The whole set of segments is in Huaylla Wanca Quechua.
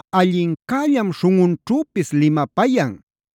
allincällam śhunꞌunćhüpis limapayan.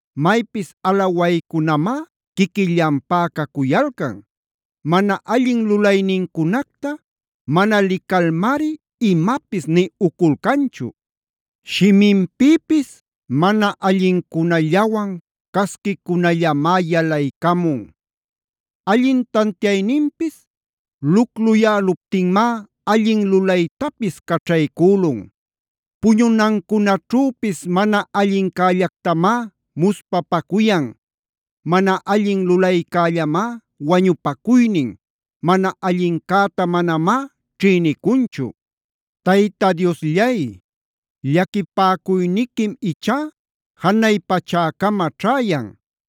Maypis alawaycunamá quiquillanpá cacuyalcan. Mana allin lulaynincunacta mana licalmari imapis nï uculcanchu. Shiminpïpis mana allincunallawan casquicunallamá yalaycamun. Allin tantiayninpis lucluyäluptinmá allin lulaytapis caćhaycülun. Puñunancunaćhüpis mana allincällactamá muspapacuyan. Mana allin lulaycällamá wañupacuynin, mana allincäta manamá ćhïnicunchu. Tayta Diosllay, llaquipäcuyniquim ichá janay pachäcama ćhäyan.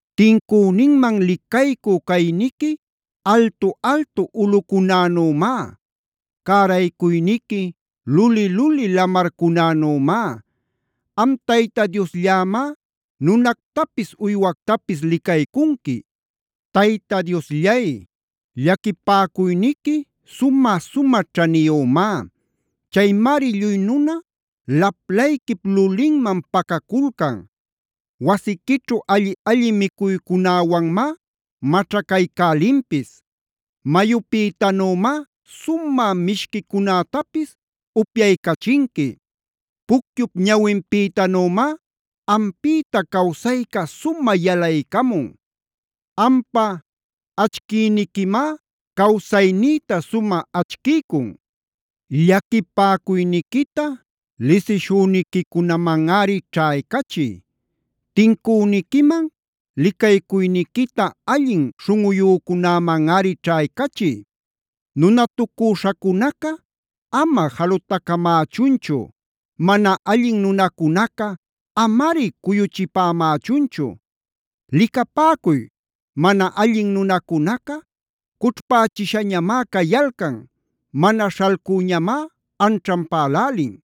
Tincüninman licaycü cayniqui altu-altu ulꞌucunänümá. Cäraycuyniqui luli-luli lamarcunänümá. Am Tayta Diosllämá nunactapis uywactapis licaycunqui. Tayta Diosllay, llaquipäcuyniqui sumä-sumä ćhaniyümá. Chaymari lluy nuna laplayquip lulinman pacaculcan. Wasiquićhu alli-alli micuycunäwanmá maćhacaycälinpis. Mayupïtanümá sumä mishquicunätapis upyaycachinqui. Pucyup ñawinpïtänümá ampïta cawsayca sumä yalaycamun. Ampa achquïniquimá cawsaynïta sumä achquiycun. Llaquipäcuyniquita lisishüniquicunamanꞌari ćhaycachiy. Tincüniquiman licaycuyniquita allin śhunꞌuyücunamanꞌari ćhaycachiy. Nunatucüśhacunaca ama jalutacamächunchu. Mana allin nunacunaca amari cuyuchipämächunchu. ¡Licapäcuy, mana allin nunacunaca cućhpächishañamá cayalcan! ¡Mana śhalcüñamá anćhanpälälin!